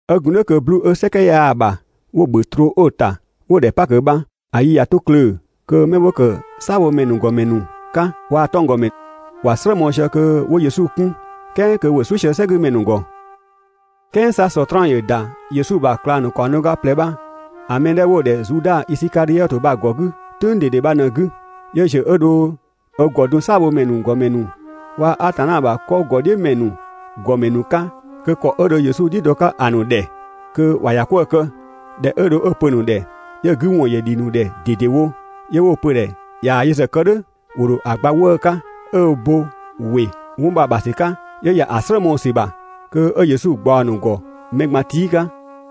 'Ö gun "dhʋ̈ kö 'bluu‑ 'ö "sɛkɛ 'yaa‑ ‑bha 'wo‑ ‑bhö ‑troo 'ö‑ ‑ta 'wo‑ ‑dhɛ 'Pakö bha, ‑a yi ꞊ya 'to klöö‑, kö 'mɛ 'wo ‑kë "saabhomɛ ‑nu ‑gɔmɛ ‑nu 'ka, waa‑ 'tɔnggɔmɛ ‑wa "slë mɔɔ‑ sië kö 'wo Yesu 'kun, "kɛɛ kö ‑wo "suʋ̈ sië "sɛgümɛ ‑nu ‑gɔ. "Kɛɛ 'sa Sɔtraan ‑yö ‑da Yesu ‑bha ꞊klang ‑nu ‑kaɔng do ga ꞊plɛ bha‑ mɛ 'dhɛ 'wo‑ ‑dhɛ Zuda Isikadhiɔtö bha‑ ‑gɔ 'gü "tʋ̈ng ꞊dede bha ꞊në‑ 'gü. 'Yö ‑ziö 'ö dho ö ‑gɔ dun "saabhomɛ ‑nu ‑gɔmɛ ‑nu waa‑ Atanna ‑bha 'kɔ ‑gɔdhiʋ̈mɛ ‑nu ‑gɔmɛ ‑nu 'ka kö ‑kɔ 'ö dho Yesu "dhiʋ̈ dɔ‑ 'ka‑ ‑nu ‑dhɛ kö ‑wa ‑ya 'kwëë‑ kë. ꞊Dhɛ 'ö dho 'ö‑ pö‑ ‑nu ‑dhɛ 'yö‑ 'gü ‑wɔn ‑yö ‑dhi ‑nu ‑dhɛ ꞊dedewo, 'yö 'wo‑ pö‑ ‑dhɛ ꞊yaa‑ yö ‑zë kë "dhʋ̈, ‑wo ‑dho ‑a gba 'wëë‑ 'ka. ꞊Dhɛ 'ö bo ‑wɩ 'wɔn bha‑ ‑bha ‑sü 'ka, 'yö ‑ya ‑a "slë mɔɔ‑ ‑sü ‑bha kö 'ö Yesu ꞊gbaɔ‑ ‑nu ‑gɔ mɛ ꞊gban tii' 'ka.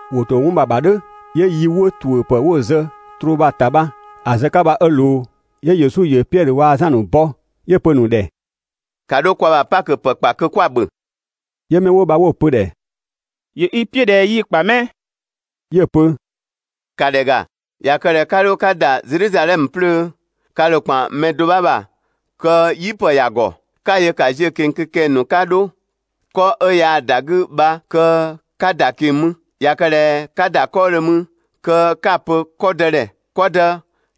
‑Wo ‑to 'wɔn bha‑ ‑bha "dhʋ̈, 'yö yi 'wo ‑tuʋ̈ ‑pë 'wo‑ zë troo bha‑ ‑ta bha‑ zë‑ 'ka bha 'ö ꞊loo. 'Yö Yesu ‑yö Piɛdhö waa‑ Zan ‑a ‑nu bɔ, 'yö‑ pö‑ ‑nu ‑dhɛ: «‑Ka 'dho kwa ‑bha Pakö ‑pë ‑kpa kö 'kwa‑ ‑bhö!» 'Yö 'mɛ 'wo bha 'wo‑ pö‑ ‑dhɛ: «‑Yö i "piʋ̈ ꞊dhɛ 'yi‑ ‑kpa 'mɛ?» 'Yö‑ pö: «‑Ka ‑dhɛ ‑ga, ꞊ya kë ꞊dhɛ 'ka 'dho 'ka ‑da Zedhizadhɛmö 'plöö, ka ‑dho ‑kpan mɛ do 'bha ‑bha kö "yipë ‑ya ‑gɔ, 'ka‑ yö ‑ka ziö‑ ꞊keng‑ kö kɛng‑ ‑nu 'ka 'dho, 'kɔ 'ö yaa‑ ‑da 'gü bha kö 'ka ‑da ꞊keng‑ mü. ꞊Ya kë ꞊dhɛ 'ka ‑da 'kɔɔdhö mü kö 'ka‑ pö‑ 'kɔ dë ‑dhɛ: «'Kɔ dë,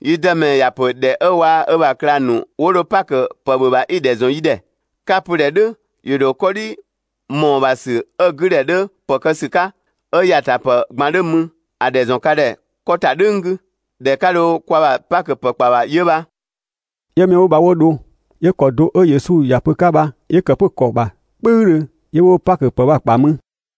yi Dëmɛ ‑ya ‑pö ‑dhɛ 'ö waa‑ ö ‑bha ꞊klang ‑nu 'wo dho 'Pakö ‑pë ‑bhö ‑bha 'i‑ ‑dhɛ ‑zɔn yi ‑dhɛ.» 'Ka‑ pö‑ ‑dhɛ "dhʋ̈ ‑yö ‑dho 'kɔdhi ‑mɔɔbhasü 'ö‑ 'gü ‑dhɛ 'dhö ‑pë kë ‑sü 'ka, 'ö ‑yatapë ꞊gban 'dhö mü, ‑a ‑dhɛ ‑zɔn ka ‑dhɛ 'kɔ ‑ta "dhʋ̈ng 'gü. ‑Dhɛ 'ka dho kwaa‑ Pakö ‑pë ‑kpa ‑bha 'yö bha.» 'Yö 'mɛ 'wo bha 'wo dho, 'yö ‑kɔ do 'ö Yesu ‑ya pö‑ 'ka bha 'yö ‑kë 'pö‑ ‑kɔ ‑bha "kpʋ̈üdhö, 'yö 'wo Pakö pë ‑kpa mü.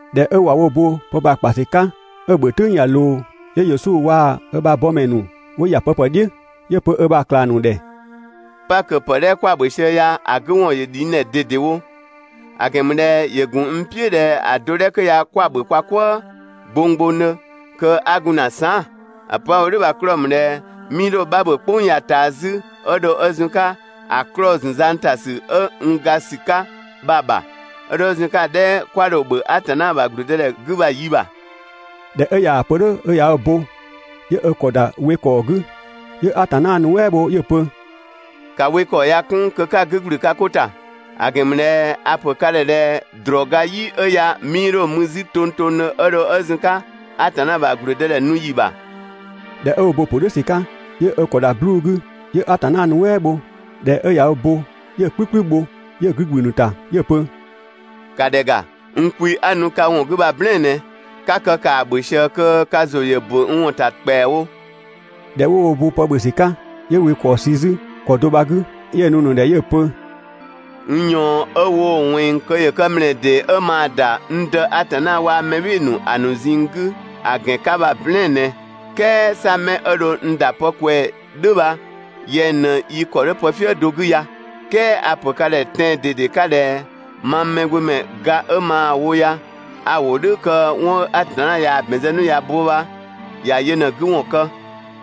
꞊Dhɛ 'ö ꞊wa wo bo pë bha‑ ‑kpa ‑sü 'ka 'ö‑ ‑bhö "tʋ̈ng ꞊ya ꞊loo, 'yö Yesu waa‑ ö ‑bha bɔmɛ ‑nu 'wo ‑ya pëpë "dhiʋ̈. 'Yö‑ pö ö ‑bha ꞊klang ‑nu ‑dhɛ: «Pakö ‑pë 'dhɛ 'kwa‑ ‑bhö sië ya ‑a 'gü ‑wɔn ‑yö ‑dhi n ‑dhɛ ꞊dedewo, ‑a ‑gɛn ‑mü ꞊dhɛ ‑yö ‑gun n "piʋ̈ ꞊dhɛ‑ do 'dhɛ 'kö ya 'kwa‑ ‑bhö kwa "kwëë gbonggbongdhö kö 'a gun ‑na saan". ‑A pö 'a‑ wo "dhʋ̈ bha‑ 'klɔɔ‑ ‑mü ꞊dhɛ 'mii 'dho‑ 'bha ‑bhö "kpʋng ya‑ ꞊taa 'zü 'ö dho 'ö zun‑ 'ka ‑a 'klɔɔ‑ zun zang ‑ta ‑sü ('ö n ga ‑sü 'ka) bha‑ ‑bha, 'ö dho 'ö zun‑ 'ka‑ 'dhɛ 'kwa dho‑ ‑bhö Atanna ‑bha ‑gblüdëdhɛ 'gü bha‑ yi ‑bha. ꞊Dhɛ 'ö ꞊yaa‑ pö "dhʋ̈ 'ö ꞊ya ö bo, 'yö ö ‑kɔ ‑da we ‑kɔɔ 'gü, 'yö Atanna nuɛ" bho 'yö‑ pö: «‑Ka we ‑kɔɔ ya‑ 'kun kö 'ka‑ 'gü ‑gblü ka 'ko ‑ta; ‑a ‑gɛn ‑mü ꞊dhɛ a‑ ‑pö ka ‑dhɛ ꞊dhɛ ‑drɔɔ ga "yi 'ö ya 'mii 'dho‑ mü 'zü tongtongdhö 'ö dho 'ö zun‑ 'ka Atanna ‑bha ‑gblüdëdhɛ nu ‑yi ‑bha.» ꞊Dhɛ 'ö ö bo‑ pö "dhʋ̈ ‑sü 'ka, 'yö ö ‑kɔ ‑da 'bluu‑ 'gü, 'yö Atanna nuɛ" bho. ꞊Dhɛ 'ö ꞊ya ö bo, 'yö‑ "kplü "kplü bho 'yö‑ 'gü ‑gblü ‑a ‑nu ‑ta 'yö‑ pö: «‑Ka ‑dhɛ ‑ga, n kwi 'a‑ nu ka ‑wɔn 'gü bha‑ "blɛɛn‑ ꞊nɛ, ['ka kë ‑kaa ‑bhö ꞊sië kö ka ‑zʋ ‑yö ‑bö n ‑wɔn ‑ta ‑kpɛawo.» ꞊Dhɛ 'wo wo bo pë ‑bhö ‑sü 'ka, 'yö wekɔɔ sü 'zü ‑kɔ do bha‑ 'gü, 'yö‑ nu‑ ‑nu ‑dhɛ 'yö‑ pö: «N ꞊yɔɔn 'ö woo‑ ꞊wɛnng kö ‑yö kë ‑mlɛɛ ‑dee 'ö maa ‑da n Dë Atanna waa‑ mɛ "bhɩɩ‑ ‑nu ‑a ‑nu ꞊zinng 'gü ‑a ‑gɛn 'ka bha‑ "blɛɛn‑ ꞊nɛ]. "Kɛɛ 'sa 'mɛ 'ö dho n ‑da pë ꞊kwɛɛ‑ "dhʋ̈ bha, yɛng ꞊në yi ‑kɔ 'dhö pëfië do 'gü ya!» "Kɛɛ a‑ ‑pö ka ‑dhɛ tɛan‑ ꞊dede 'ka ꞊dhɛ mang Mɛgbömɛ ga 'ö maa‑ wo ya 'a‑ wo "dhʋ̈ kö 'wɔn 'ö Atanna ꞊yaa‑ ‑bɛn zë 'nu ꞊ya bo bha ‑ya yö ꞊në‑ 'gü ‑wɔn kë,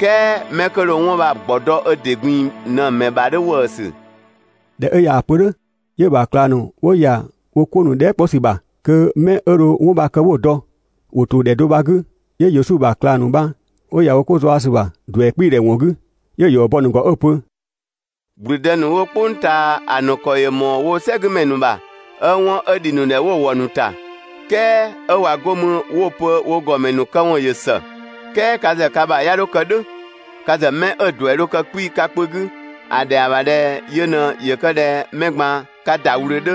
"kɛɛ 'mɛ 'kö dho 'wɔn bha‑ ‑gbɔ dɔ ö ‑dɩ ꞊gbin‑ ꞊në‑ ‑mɛ ‑bha 'dhö ‑wëësü! ꞊Dhɛ 'ö ꞊yaa‑ pö "dhʋ̈, 'yö‑ ‑bha ꞊klang ‑nu 'wo ‑ya wo 'ko ‑nu dhɛɛ" 'kpɔ ‑sü ‑bha kö 'mɛ 'ö dho 'wɔn bha‑ kë 'wo‑ dɔ. ‑Wo ‑to ‑dhɛ do bha‑ 'gü, 'yö Yesu ‑bha ꞊klang ‑nu bha 'wo ‑ya wo 'ko zaɔ‑ ‑sü ‑bha ‑duɛ 'kpiidhɛ ‑wɔn 'gü, 'yö‑ ‑yɔ bɔ‑ ‑nu ‑gɔ 'ö‑ pö: «‑Gblüdë ‑nu 'wo "kpʋng ꞊taa ‑a ‑nu ‑kɔ ‑yö ‑mɔɔ woo‑ "sɛgümɛ ‑nu ‑bha, 'ö 'wɔn 'ö ‑dhi ‑nu ‑dhɛ 'wo‑ ‑wɔ ‑nu ‑ta, "kɛɛ 'ö ꞊wa 'go mü 'wo‑ pö wo ‑gɔmɛ ‑nu këwɔn ‑yö ‑së. "Kɛɛ ka ‑zë ka ‑bha 'ya 'dho kë "dhʋ̈. Ka ‑zë 'mɛ 'ö‑ ‑duɛ dho kë 'kpii‑ ka kpö 'gü, ‑a ‑dhɛa ‑bha ꞊dhɛ yö ꞊në ‑yö kë ꞊dhɛ mɛ ꞊gban ka ‑da ꞊wlöö 'dhö,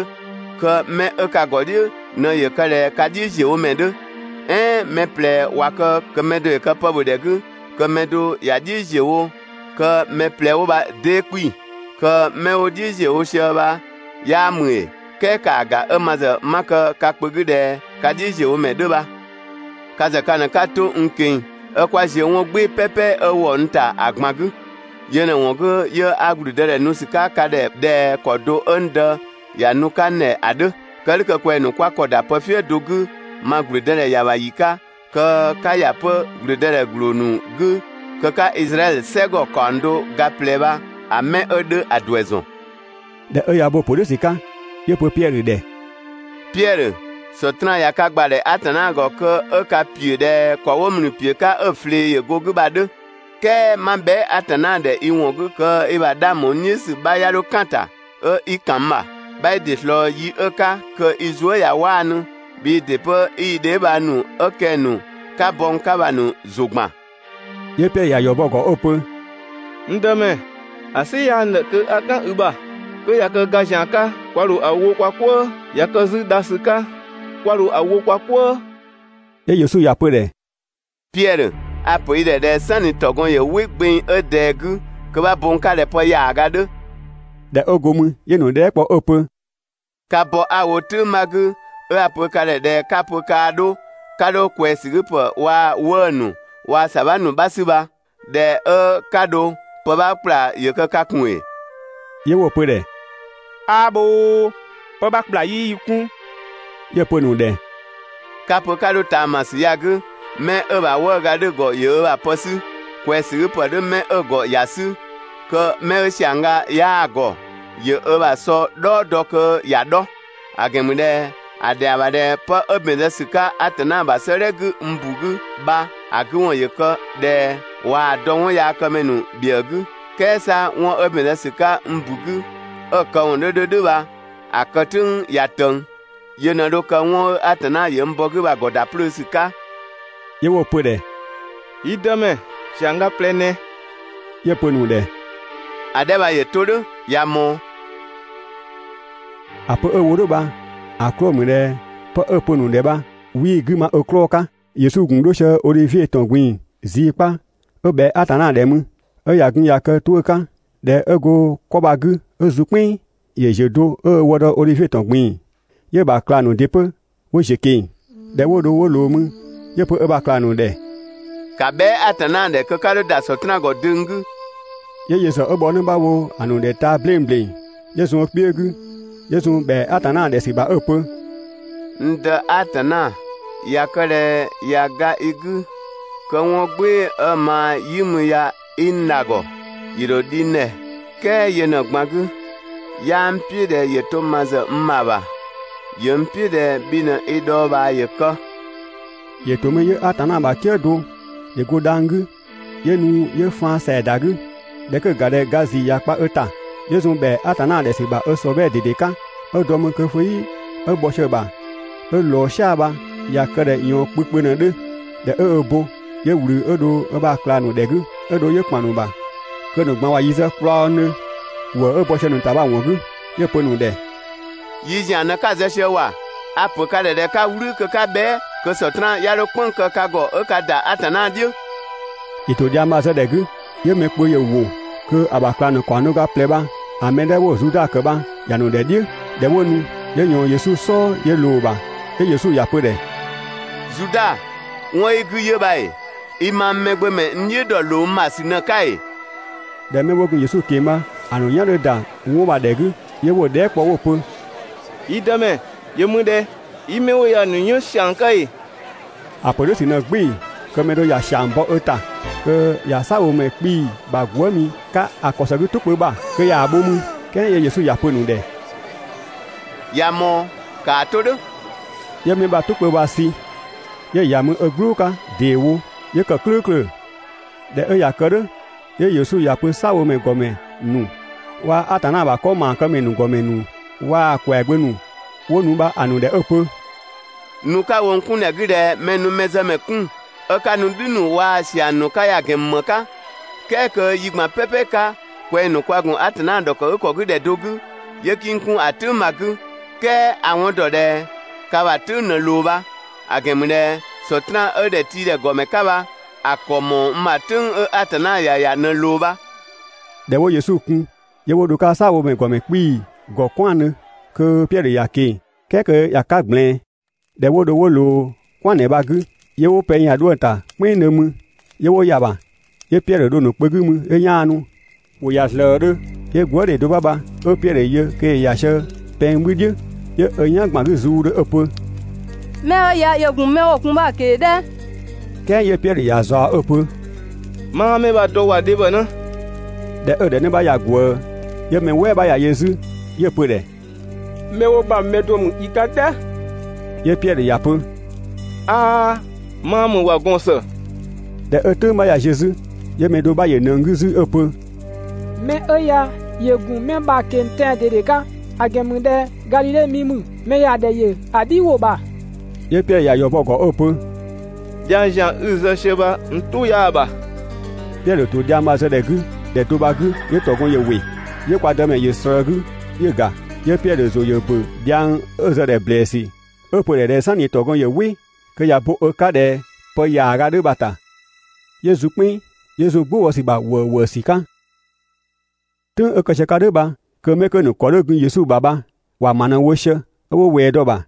kö mɛ 'ö ka ‑gɔdhiʋ̈ ꞊në ‑yö kë ꞊dhɛ ka "dhiʋ̈ ‑ziöwomɛ 'dhö. "Ɛɛn mɛ ꞊plɛ ꞊wa kë kö mɛ do ‑yö kë pë ‑bhö ‑dhɛ 'gü, kö mɛ do ‑ya "dhiʋ̈ ‑ziö wo kö mɛ ꞊plɛ 'wo bha 'dee 'kpii‑? Kö 'mɛ 'wo‑ "dhiʋ̈ ‑ziö wo sië bha 'yaa ‑mü ‑ee? "Kɛɛ ‑kaa ‑ga 'ö ma ‑zë 'ma kë ka kpö 'gü ꞊dhɛ ka "dhiʋ̈ ‑ziöwomɛ 'dhö bha. Ka ‑zë ka ꞊në 'ka 'to n ꞊keng‑ 'ö 'kwa ‑ziö 'wɔn "gbɩɩ‑ "pɛpɛ 'ö ‑wɔ n ‑ta ‑a ꞊gban 'gü. Yö ꞊në ‑wɔn 'gü, 'yö 'a ‑gblüdëdhɛ nu ‑sü 'ka ka ‑dhɛ ꞊dhɛ ‑kɔ do 'ö n Dë ‑ya nu‑ 'ka n ‑dhɛ ‑a 'dhö. Kë "dhʋ̈ kö kwɛng‑ ‑nu 'kwa ‑kɔ ‑da pëfië do 'gü ma ‑gblüdëdhɛ ‑ya ‑bha ‑yi 'ka, kö 'ka ‑ya 'pö ‑blüdëdhɛ ‑gbloo ‑nu 'gü kö 'ka Izraɛdhö "sɛgɔ ‑kaɔng do ga ꞊plɛ bha‑ 'mɛ 'ö 'dhö ‑a ‑duɛ ‑zɔn.» ꞊Dhɛ 'ö ꞊ya ö bo‑ ‑pö "dhʋ̈ ‑sü 'ka, 'yö‑ pö Piɛdhö ‑dhɛ: «Piɛdhö, Sɔtraan ꞊ya ka ‑gbadhɛ Atanna ‑gɔ kö 'ö ka ‑piö ꞊dhɛ ‑kɔ 'wo ‑mlü ‑piö 'ka 'ö‑ ꞊flee ‑yö go‑ 'gü bha‑ 'dhö, "kɛɛ 'ma bhɛa" Atanna ‑dhɛ i ‑wɔn 'gü kö i ‑bha 'dhang ‑bho n "dhiʋ̈ ‑sü 'bha 'ya 'dho "kan‑ ‑ta 'ö 'i ‑kan n ‑bha. 'Bha i ‑dɩ ꞊slɔɔ yi 'ö‑ 'ka kö i zuë" ꞊ya 'waanu, bhii ‑dɩ 'pö 'i i dheebhang ‑nu 'ö kɛng‑ ‑nu 'ka bɔ n 'ka bha‑ ‑nu ‑zʋ ‑gban.» 'Yö Piɛdhö ꞊ya ‑yɔ bɔ‑ ‑gɔ 'ö‑ pö: «N Dëmɛ, ‑a "sɩ 'yaa n ‑dhɛ kö 'a "kan i ‑bha. 'Kö ꞊ya kë ga ‑zian 'ka kwa ‑dho ‑a wo kwa "kwëë, ꞊ya kë 'zü dha ‑sü 'ka kwa ‑dho ‑a wo kwa "kwëë.» 'Yö Yesu ‑ya pö‑ ‑dhɛ: «Piɛdhö, a‑ ‑pö i ‑dhɛ ꞊dhɛ "sanni ‑tɔgɔn ‑yö "wɩ gbeng 'ö ꞊dɛɛ 'gü, kö 'bha bo n 'ka ꞊dhɛ pë ‑yaaga 'dhö.» ꞊Dhɛ 'ö go mü 'yö‑ ‑nu dhɛɛ" kpɔ 'ö‑ pö: «Ka bɔ 'a‑ wo "tʋ̈ng 'bha 'gü, 'ö 'a‑ pö ka ‑dhɛ ꞊dhɛ 'ka‑ pö kaa 'dho 'ka 'dho ꞊kwɛɛsügüpë waa‑ 'wëë‑ ‑nu, 'waa ‑sabha ‑nu 'bha 'sü bha, ꞊dhɛ 'ö 'ka dho pë 'bha ‑kpla ‑yö kë ka ‑kun ‑ee?» 'Yö 'wo‑ pö‑ ‑dhɛ: «'Aa bhoo, pë 'bha ‑kpla 'yii yi 'kun.» 'Yö‑ pö‑ ‑nu ‑dhɛ: «'Ka‑ pö 'ka 'dho ꞊taamasü ya‑ 'gü, 'mɛ 'ö‑ ‑bha 'wëëga 'dhö‑ ‑gɔ ‑yö ö ‑bha pë 'sü, ꞊kwɛɛsügüpë 'dhö 'mɛ 'ö‑ ‑gɔ ‑ya 'sü, kö 'mɛ 'ö ‑siangga 'yaa‑ ‑gɔ, ‑yö ö ‑bha ‑sɔ "dhɔɔ dɔ kö ‑ya 'dhɔ; ‑a ‑gɛn ‑mü ꞊dhɛ ‑a ‑dhɛa ‑bha ꞊dhɛ 'pë 'ö ‑bɛn zë ‑sü 'ka Atanna ‑bha 'sëëdhɛ 'gü n ‑bu 'gü bha, ‑a 'gü ‑wɔn ‑yö kë ꞊dhɛ: ‹꞊Waa‑ dɔ 'wɔnyaakëmɛ ‑nu ‑bhiëë 'gü.› "Kɛɛ 'sa 'wɔn 'ö ‑bɛn zë ‑sü 'ka n ‑bu 'gü, 'ö‑ këwɔn 'dhö 'dhö "dhʋ̈ bha‑ kë "tʋ̈ng ꞊ya ꞊tëng. Yö ꞊në dho kë 'wɔn 'ö Atanna ‑yö n bɔ‑ 'gü bha‑ ‑gɔ ‑da 'plöö ‑sü 'ka.» 'Yö 'wo‑ pö‑ ‑dhɛ: «Yi Dëmɛ, ‑siangga ꞊plɛ ꞊nɛ!» 'Yö‑ pö‑ ‑nu ‑dhɛ: «‑A 'dhɛ bha ‑yö 'to "dhʋ̈, ꞊ya ꞊mɔɔ.» (‑A pö 'ö‑ wo "dhʋ̈ bha‑ 'klɔɔ‑ ‑mü ꞊dhɛ 'pë 'ö‑ pö‑ ‑nu ‑dhɛ bha 'wii‑ 'gü ma ö 'klɔɔ‑ 'ka.) Yesu ‑gun 'dho sië Odhivie ‑tɔn ꞊gbin‑ zii 'kpa 'ö ꞊bhɛa Atanna ‑dhɛ mü, 'ö ꞊ya gun ꞊ya kë‑ 'tuʋ̈‑ 'ka. ꞊Dhɛ 'ö go 'kɔ bha‑ 'gü 'ö zun "kpɛnng, ‑yö ‑ziö do 'ö ö wë dɔ Odhivie ‑tɔn ꞊gbin‑, 'yö‑ ‑bha ꞊klang ‑nu ‑dɩ 'pö 'wo ‑ziö ꞊keng‑. ꞊Dhɛ 'wo dho 'wo ꞊loo mü, 'yö‑ pö ö ‑bha ꞊klang ‑nu ‑dhɛ: «‑Ka bhɛa" Atanna ‑dhɛ kö 'ka 'dho ‑da Sɔtraan ‑gɔ döng 'gü!» 'Yö yö ‑zë 'ö bhɔ 'në 'bha wo‑ ‑nu ‑dhɛ taa‑ 'bleng ‑bleng 'yö zun ö kpiö 'gü, 'yö zun ‑bhɛa Atanna ‑dhɛ ‑sü ‑bha 'ö‑ pö: «N Dë Atanna, ꞊ya kë ꞊dhɛ ꞊ya ga i 'gü kö 'wɔn "gbɩɩ‑ 'ö maa‑ "yi mü ya 'i n dha‑ ‑gɔ, ‑yö ‑dho ‑dhi n ‑dhɛ, "kɛɛ yö ꞊në‑ ꞊gban 'gü, 'yaa n "piʋ̈ ꞊dhɛ ‑yö 'to ma ‑zë n ‑bha ‑bha, ‑yö n "piʋ̈ ꞊dhɛ bhi ꞊në i dhɔɔbhaa ‑yö kë.» [‑Yö ‑to mü 'yö Atanna ‑bha "kië do ‑yö go dhang‑ 'gü 'yö nu 'yö faan ‑sɛa ‑da 'gü. ꞊Dhɛ 'kö 'ö‑ ‑ga ꞊dhɛ ga ‑zii ꞊ya kpa ö ‑ta, 'yö zun ‑bhɛa Atanna ‑dhɛ ‑sü ‑bha ö ‑sɔbhɛɛ ꞊dede 'ka, 'ö dɔ mü kö 'fëyi 'ö bhɔ sië‑ ‑bha 'ö ꞊loo "sia‑ bha, ꞊ya kë ꞊dhɛ ꞊yɔɔn kpö kpö ꞊në‑ 'dhö.] ꞊Dhɛ 'ö ö bo, 'yö ꞊wlü 'ö dho ö ‑bha ꞊klang ‑nu ‑dhɛ 'gü, 'ö dho ‑yö ‑kpan ‑a ‑nu ‑bha kö ‑a ‑nu ꞊gban ꞊wa yi zë kplɔɔngdhö ‑wëë 'ö bɔ sië‑ ‑nu ‑ta bha‑ ‑wɔn 'gü. 'Yö‑ pö‑ ‑nu ‑dhɛ: «Yi ‑zian ꞊në 'ka‑ zë sië ‑wa! A‑ ‑pö ka ‑dhɛ ꞊dhɛ 'ka "wlü kö 'ka bhɛa" kö Sɔtraan 'ya 'dho "kpënng‑ kë ka ‑gɔ 'ö 'ka ‑da Atanna "dhiʋ̈!» ‑Yö ‑to dhiang bha‑ zë ‑dhɛ 'gü, 'yö mɛ kpö ‑yö ‑wo kö‑ ‑bha ꞊klang ‑nu ‑kaɔng do ga ꞊plɛ bha‑ mɛ 'dhɛ 'wo‑ Zuda ‑kë bha ‑ya ‑nu ‑dhɛ "dhiʋ̈. ꞊Dhɛ 'wo nu, 'yö ꞊yɔɔn Yesu "sɔɔ 'yö ꞊loo‑ ‑bha. 'Yö Yesu ‑ya pö‑ ‑dhɛ: «Zuda, 'wɔn 'ö i 'gü 'yö bha ‑ee? I mang Mɛgbömɛ n "dhiʋ̈ ‑dɔ ‑loo n ‑bha ‑sü ꞊në‑ 'ka ‑ee?» ꞊Dhɛ 'mɛ 'wo gun Yesu ꞊keng‑ bha‑ ‑nu "yan 'dhö ‑da 'wɔn bha‑ ‑dhɛ 'gü, 'yö 'wo‑ dhɛɛ" kpɔ 'wo‑ pö: «Yi Dëmɛ, ‑yö mü ꞊dhɛ, 'yi 'mɛ 'wo‑ ya‑ ‑nu 'yën ‑siang 'ka ‑ee?» ‑A ‑pö "dhʋ̈ ‑sü ꞊në "gbɩɩ‑ kö‑ mɛ do ꞊ya ‑siang bɔ ö ‑ta kö ꞊ya "saabhomɛ 'kpii‑ ‑bha gwëëmi zë‑ 'ka‑ ‑kɔ ‑së 'gü "tʋ kpö ‑bha kö ꞊yaa‑ bho mü. "Kɛɛ 'yö Yesu ‑ya pö‑ ‑nu ‑dhɛ: «꞊Ya ꞊mɔɔ! ‑Kaa 'to "dhʋ̈.» 'Yö 'mɛ bha‑ "tʋ kpö bha ‑sü 'yö‑ ‑ya mü ö "gblʋʋ 'ka ‑deewo 'yö‑ ‑kë "klʋ̈ʋ̈klʋ̈. ꞊Dhɛ 'ö ꞊ya kë "dhʋ̈, 'yö Yesu ‑ya pö "saabhomɛ ‑gɔmɛ ‑nu waa‑ Atanna ‑bha 'kɔ ‑maakëmɛ ‑nu ‑gɔmɛ ‑nu waa‑ ‑kwɛagbö ‑nu 'wo nu bha‑ ‑nu ‑dhɛ 'ö‑ pö: «Nu 'ka‑ wo n 'kun ‑dhɛ 'gü ꞊dhɛ mɛ‑ nu mɛzëmɛ 'kun, 'ö 'ka nu "dhü ‑nu waa‑ ‑siang ‑nu 'ka ya‑ ‑gɛn ‑mü ‑më 'ka? "Kɛɛ kö yi ꞊gban "pɛpɛ 'ka, kwɛng‑ ‑nu kwa ‑gun Atanna ‑dhɔkëgükɔ 'gü ‑dhɛ do 'gü, 'yö 'kii n 'kun ‑a "tʋ̈ng bha‑ 'gü, "kɛɛ a‑ 'wɔn ‑dɔ ꞊dhɛ ka ‑bha "tʋ̈ng ꞊në ꞊loo bha, ‑a ‑gɛn ‑mü ꞊dhɛ Sɔtraan 'ö ‑dhɛtiidhɛ ‑gɔmɛ 'ka bha, ‑a ‑kɔ ‑mɔɔ n ‑bha "tʋ̈ng 'ö Atanna ‑ya ‑ya ꞊në ꞊loo bha. ꞊Dhɛ 'wo Yesu kun, 'yö 'wo dho‑ 'ka "saabhomɛ ‑nu ‑gɔmɛ 'kpii‑ ‑gɔ "kwɛandhö kö Piɛdhö ‑ya ꞊keng‑ "kɛɛ kö ‑ya 'ka ꞊gblɛɛn. ꞊Dhɛ 'wo dho 'wo ꞊loo "kwɛandhɛ bha‑ 'gü, 'yö 'wo pɛng ‑ya 'dhuëng ‑ta "kpɛnngdhö mü, 'yö 'wo ‑ya ‑bha. 'Yö Piɛdhö dho‑ ‑nu kpö 'gü mü 'yö 'yaanu. ‑Wo ‑ya ‑zlëëdhö, 'yö gwëëdhe do 'bha bha 'ö Piɛdhö yö kö ‑yö ‑ya sië pɛng 'bhü "dhiʋ̈, 'yö ö "yan ‑gban 'gü zuudhö 'ö‑ pö: «'Mɛ 'ö ya ‑yö ‑gun 'mɛ 'wo‑ kun bha‑ ꞊keng‑ "dhɛ!» "Kɛɛ 'yö Piɛdhö ‑ya ꞊zaɔ‑ 'ö‑ pö: «'Maa 'mɛ bha‑ dɔ ‑wa, dhebhɔnë!» ꞊Dhɛ 'ö‑ ‑dhɛ 'në bha ꞊ya ꞊gwëë, 'yö mɛ "wɛɛ 'bha ‑ya yö 'zü 'yö‑ pö‑ ‑dhɛ: «'Mɛ 'wo bha‑ mɛ do ‑mü i 'ka "dhɛ!» 'Yö Piɛdhö ‑ya pö: «'Aa, 'maa ‑mü ‑wa, gɔɔn‑ ‑së!» ꞊Dhɛ 'ö "tʋ̈ng 'bha ꞊ya ziö 'zü, 'yö mɛ do 'bha ‑yö ꞊nëng 'gü 'zü 'ö‑ pö: «'Mɛ 'ö ya ‑yö ‑gun 'mɛ bha‑ ꞊keng‑ tɛan‑ ꞊dede 'ka, ‑a ‑gɛn ‑mü ꞊dhɛ Gadhidhe mi ‑mü, (mɛ ‑ya ‑dhɛ ‑yö ‑a "dhi ‑wʋ ‑bha).» 'Yö Piɛdhö ‑ya ‑yɔ bɔ‑ ‑gɔ 'ö‑ pö: «Dhiang ‑zian 'i‑ zë sië bha n "tʋ 'yaa‑ ‑bha.» Piɛdhö ‑to dhiang bha‑ zë ‑dhɛ 'gü ‑dhɛ do bha‑ 'gü 'yö ‑tɔgɔn ‑yö ‑wɩ. 'Yö kwa Dëmɛ ‑yö ꞊slëë ö 'gü 'yö‑ ‑ga. 'Yö Piɛdhö ‑zʋ ‑yö ‑bö 'pö dhiang 'ö‑ zë‑ ‑dhɛ ‑blɛɛsü, 'ö‑ pö ꞊dhɛ "sanni ‑tɔgɔn ‑yö "wɩ, kö ꞊ya bo ö 'ka ꞊dhɛ pë ‑yaaga 'dhö bha‑ ‑ta. 'Yö zun "kpɛnng, 'yö zun "gbʋ bɔ ‑sü ‑bha ‑wëëwëësü 'ka. "Tʋ̈ng 'ö kë sië‑ 'ka "dhʋ̈ bha kö 'mɛ 'kö‑ ‑nu ‑kɔ 'dhö gun Yesu ‑bha bha ‑wa ‑ma ꞊në wo sië 'ö 'wo ꞊wɛɛ dɔ‑ ‑bha.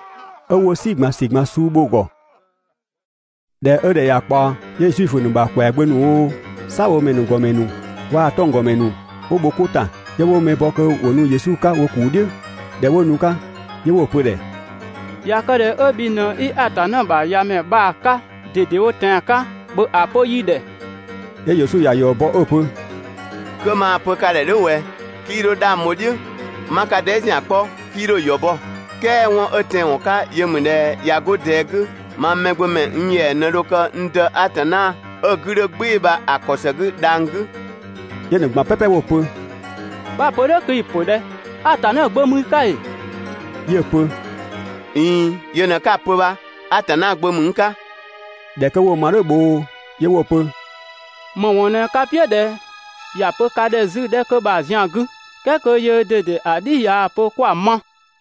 'Ö 'wo "si ꞊gban ‑si ꞊gban suu bho‑ ‑gɔ. ꞊Dhɛ 'ö ‑dhɛ ꞊ya ꞊kpaɔ, 'yö Zuifö ‑nu ‑bha ‑kwɛagbö ‑nu oo, "saabhomɛ ‑nu ‑gɔmɛ ‑nu waa‑ 'tɔnggɔmɛ ‑nu 'wo bho 'ko ‑ta, 'yö 'wo mɛ bɔ kö ‑wo nu Yesu 'ka wo ‑kuu "dhiʋ̈. ꞊Dhɛ 'wo nu‑ 'ka, 'yö 'wo‑ pö‑ ‑dhɛ: «꞊Ya kë ꞊dhɛ 'ö bhi ꞊në 'i Atanna ‑bha ‑Yamɛ bha‑ 'ka ꞊dedewo tɛan‑ 'ka, ‑bhö ‑a pö yi ‑dhɛ!» 'Yö Yesu ‑ya ‑yɔ bɔ 'ö‑ pö: «'Kö maa‑ pö ka ‑dhɛ "dhʋ̈ ꞊wɛ, 'kii 'dho 'dhang bho‑ "dhiʋ̈, 'ma ka dhɛɛ" ‑zian 'kpɔ, 'kii 'dho‑ ‑yɔ bɔ, "kɛɛ 'wɔn 'ö tɛanwɔn 'ka yö ‑mü ꞊dhɛ ꞊ya 'go ꞊dɛɛ 'gü, mang Mɛgbömɛ, n ‑yɛa ꞊në dho kë n Dë Atanna 'ö‑ 'gü 'dhö "gbɩɩ‑ bha‑ ‑kɔ ‑së 'gü dhang‑ 'gü.» 'Yö‑ ‑nu ꞊gban "pɛpɛ 'wo‑ pö: «'Bha‑ pö "dhʋ̈ kö i‑ ‑pö ꞊dhɛ? Atanna Gbö ‑mü i 'ka ‑ee?» 'Yö‑ pö: «꞊Iin, yö ꞊në 'ka‑ pö bha, Atanna Gbö ‑mü n 'ka.» ꞊Dhɛ 'kö 'wo‑ ma "dhʋ̈ bhoo 'yö 'wo‑ pö: «‑Më ‑wɔn ꞊në ka "piʋ̈ ꞊dhɛ ‑ya pö ka ‑dhɛ 'zü‑ 'dhɛ 'kö bha‑ zian 'gü, "kɛɛ kö yöö ꞊dede ‑a "dhi ꞊yaa‑ pö kö 'kwa‑ ma?»